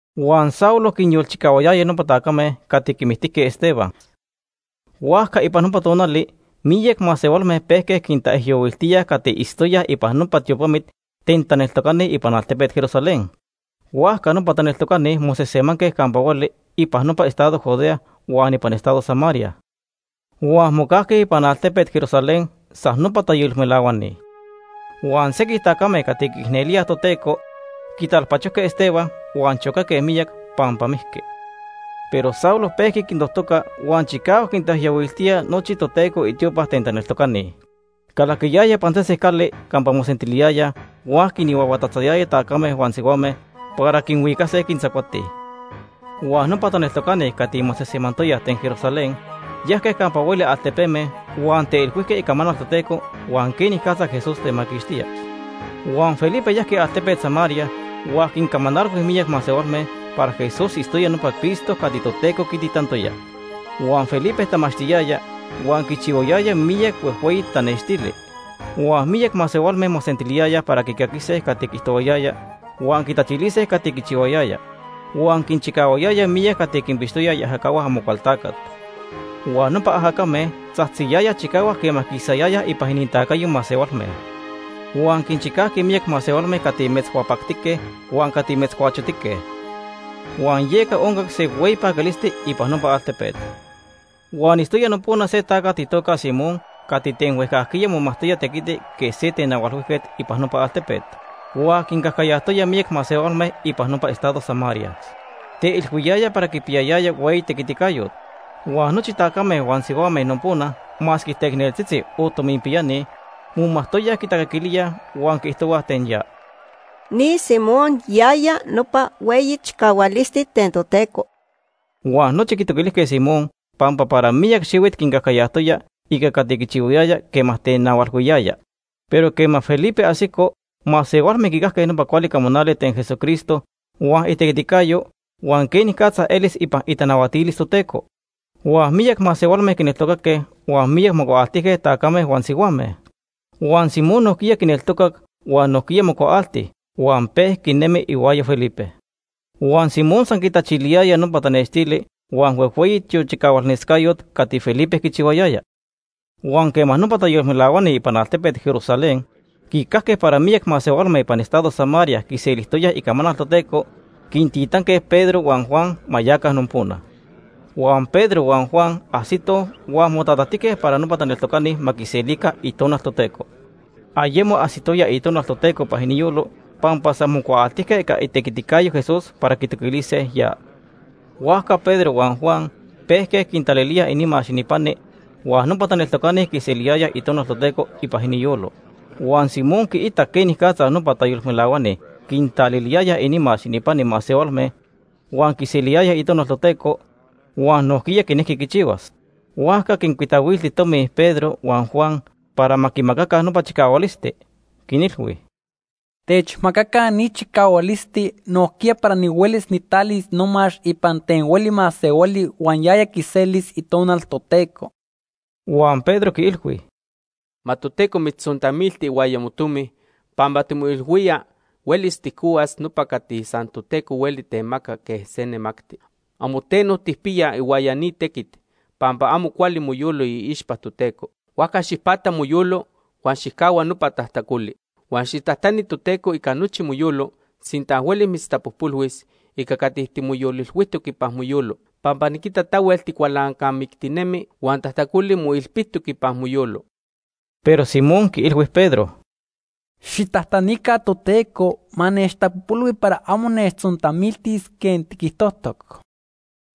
Huan Saulo quinyolchicahuayaya nopa tacame cati quimictijque Esteban. Huajca ipan nopa tonali miyac masehualme pejque quintaijyohuiltíaj cati itztoyaj ipan nopa tiopamit ten taneltocani ipan altepet Jerusalén. Huajca nopa taneltocani mosejsemanque campa hueli ipan nopa estado Judea huan ipan estado Samaria. Huan mocajque ipan altepet Jerusalén san nopa tayolmelahuani. Huan sequij tacame cati quiicnelíaj Toteco quitalpachojque Esteban huan chocaque miyac pampa mijqui. Pero Saulo pejqui quintojtoca huan chicahuac quintaijyohuiltía nochi Toteco itiopa ten taneltocani. Calaquiyaya ipan sesen cali campa mosentiliyayaj huan quinhuahuatatzayaya tacame huan sihuame para quinhuicase quintzacuase. Huan nopa taneltocani cati mosejsemantoyaj ten Jerusalén, yajque campa hueli altepeme huan teilhuijque icamanal Toteco huan quenicatza Jesús temaquixtía. Huan Felipe yajqui altepet Samaria huan quincamanalhui miyac masehualme para Jesús itztoya nopa Cristo cati Toteco quititantoya. Huan Felipe tamachtiyaya huan quichihuayaya miyac huejhueyi tanextili. Huan miyac masehualme mosentiliyayaj para quicaquise cati quiijtohuayaya huan quitachilise cati quichihuayaya. Huan quinchicahuayaya miyac cati quinpixtoyaj iajacahua Amocualtacat. Huan nopa ajacame tzajtziyayaj chicahuac quema quisayayaj ipan inintacayo masehualme. Huan quinchicajqui miyac masehualme cati metzhuapactique huan cati metzcuachotique. Huan yeca oncac se hueyi paquilisti ipan nopa altepet. Huan itztoya nopona se tacat itoca Simón cati ten huejcajquiya momajtoya tequiti quej se tenahualhuijquet ipan nopa altepet. Huan quincajcayajtoya miyac masehualme ipan nopa estado Samaria. Teilhuiyaya para quipiyayaya hueyi tequiticayot. Huan nochi tacame huan sihuame nopona masque teicneltzitzi o tominpiyani momajtoyaj quitacaquilíaj huan quiijtohuaj ten ya: “Ni Simón yaya nopa Hueyi Chicahualisti Ten Toteco.” Huan nochi quitoquilijque Simón pampa para miyac xihuit quincajcayajtoya ica cati quichihuayaya quema tenahualhuiyaya. Pero quema Felipe ajsico, masehualme quicajque nopa cuali camanali ten Jesucristo huan itequiticayo huan quenicatza elis ipan itanahuatilis Toteco. Huan miyac masehualme quineltocaque huan miyac mocuaaltijque, tacame huan sihuame. Huan Simón nojquiya quineltocac huan nojquiya mocuaalti huan pejqui nemi ihuaya Felipe. Huan Simón san quitachiliyaya nopa tanextili huan huejhueyi tiochicahualnescayot cati Felipe quichihuayaya. Huan quema nopa tayolmelahuani ipan altepet Jerusalén quicajque para miyac masehualme ipan estado Samaria quiselijtoyaj icamanal Toteco, quintitanque Pedro huan Juan ma yaca nopona. Huan Pedro huan Juan ajsitoj huan motatajtijque para nopa taneltocani ma quiselica Itonal Toteco. Ayemo ajsitoya Itonal Toteco ipan iniyolo, pampa san mocuaaltijque ica itequiticayo Jesús para quitoquilise ya. Huajca Pedro huan Juan pejque quintalilíaj inimax ininpani huan nopa taneltocani quiseliyayaj Itonal Toteco ipan iniyolo. Huan Simón quiitac quenicatza nopa tayolmelahuani quintaliliyayaj inimax ininpani masehualme huan quiseliyayaj Itonal Toteco, huan nojquiya quinejqui quichihuas. Huajca quincuitahuilti tomi Pedro huan Juan para ma quimacaca nopa chicahualisti. Quinilhui: ―Techmacaca ni chicahualisti nojquiya para nihuelis nijtalis nomax ipan ten hueli masehuali huan yaya quiselis Itonal Toteco. Huan Pedro quiilhui: ―Ma Toteco mitztzontamilti ihuaya motomi pampa timoilhuía huelis tijcohuas nopa cati san Toteco hueli temaca quej se nemacti. Amo teno tijpiya ihuaya ni tequit pampa amo cuali moyolo iixpa Toteco. Huajca xijpata moyolo huan xijcahua nopa tajtacoli. Huan xijtajtani Toteco ica nochi moyolo sinta huelis mitztapojpolhuis ica cati timoyolilhuijtoc ipan moyolo, pampa niquita tahuel ticualancamictinemi huan tajtacoli moilpitoc ipan moyolo. Pero Simón quiilhui Pedro: ―Xijtajtanica Toteco ma nechtapojpolhui para amo nechtzontamiltis quej tiquijtojtoc.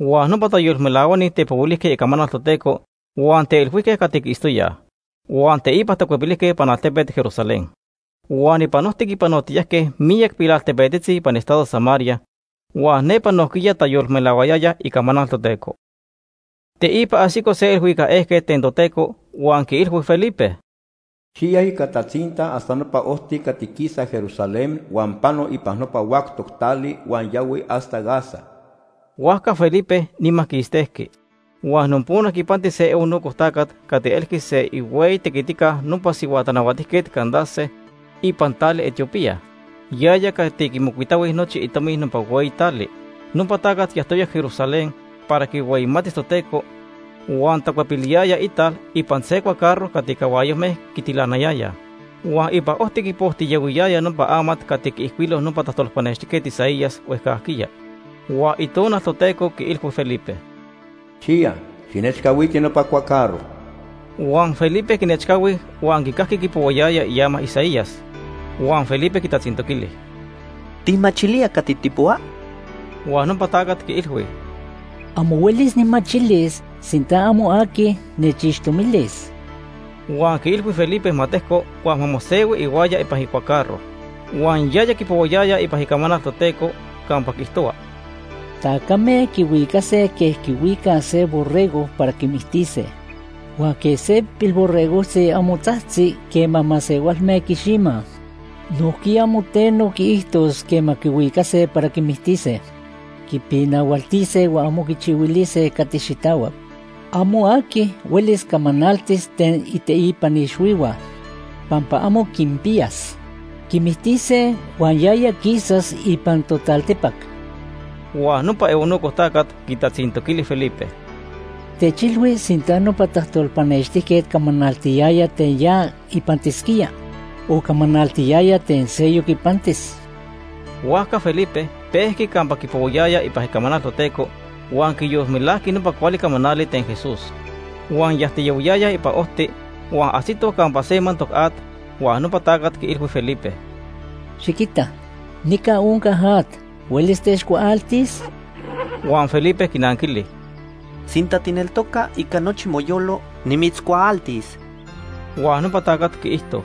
Huan nopa tayolmelahuani tepohuilijque icamanal Toteco huan teilhuijque cati quiitztoyaj. Huan teipa tacuepilijque ipan altepet Jerusalén. Huan ipan ojti quipanotiyajque miyac pilaltepetzitzi ipan estado Samaria huan nepa nojquiya tayolmelahuayayaj icamanal Toteco. Teipa ajsico se ilhuicac ejquet ten Toteco huan quiilhui Felipe: “Xiya ica tatzinta hasta nopa ojti cati quisa Jerusalén huan pano ipan nopa huactoc tali huan yahui hasta Gaza.” Huajca Felipe nima quistejqui. Huan nopona quipanti se eunuco tacat cati elqui se ihueyi tequitica nopa sihua tanahuatijquet Candace ipan tali Etiopía. Yaya cati quimocuitahui nochi itomi nopa hueyi tali. Nopa tacat yajtoya Jerusalén para quihueyimatis Toteco, huan tacuepiliyaya ital ipan se cuacarro cati cahuayojme quitilanayayaj. Huan ipan ojti quipojtiyahuiyaya nopa amat cati quiijcuilo nopa tajtolpanextijquet Isaías huejcajquiya. Huan Itonal Toteco quiilhui Felipe: ―Xiya, xijnechcahuiti nopa cuacarro. Huan Felipe quinechcahui huan quicajqui quipohuayaya iama Isaías. Huan Felipe quitatzintoquili: ―¿Tijmachilía cati tijpohua? Huan nopa tacat quiilhui: ―Amo huelis nijmachilis sinta amo aqui nechixtomilis. Huan quiilhui Felipe ma tejco huan ma mosehui ihuaya ipan icuacarro. Huan yaya quipohuayaya ipan Icamanal Toteco campa quiijtohua: “Tacame quihuicase quej quihuicaj se borrego para quimictise. Huan quej se pilborregojtzi amo tzajtzi quema masehualme quiximaj, nojquiya amo teno quiijtos quema quihuicase para quimictise. Quipinahualtise huan amo quichihuilise cati xitahuac. Amo aqui huelis camanaltis ten iteipan ixhuihua, pampa amo quinpiyas. Quimictise huan yaya quisas ipan totaltipac.” Huan nopa eunuco tacat quitatzintoquili Felipe: ―Techilhui sinta nopa tajtolpanextijquet camanaltiyaya ten ya ipantisquía, o camanaltiyaya ten seyoc ipantis. Huajca Felipe pejqui campa quipohuayaya ipan Icamanal Toteco huan quiyolmelajqui nopa cuali camanali ten Jesús. Huan yajtiyahuiyayaj ipan ojti, huan ajsitoj campa se mantoc at huan nopa tacat quiilhui Felipe: ―Xiquita, nica onca at. ¿Huelis techcuaaltis? Huan Felipe quinanquili: ―Sinta tijneltoca ica nochi moyolo, nimitzcuaaltis. Huan nopa tacat quiijto: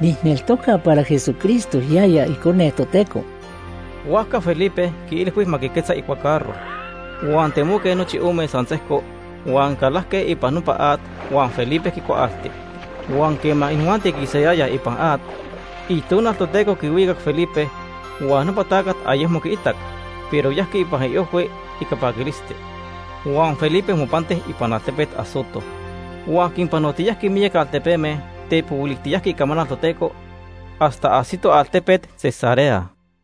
―Nijneltoca para Jesucristo yaya Icone Toteco. Huajca Felipe quiilhui ma quiquetza icuacarro. Huan temoque nochi ome san sejco huan calajque ipan nopa at huan Felipe quicuaalti. Huan quema inijuanti quisayayaj ipan at, Itonal Toteco quihuicac Felipe, huan nopa tacat ayecmo quiitac, pero yajqui ipan iojhui ica paquilisti. Huan Felipe mopanti ipan altepet Azoto. Huan quinpanotiyajqui miyac altepeme tepohuilijtiyajqui icamanal Toteco hasta ajsito altepet Cesarea.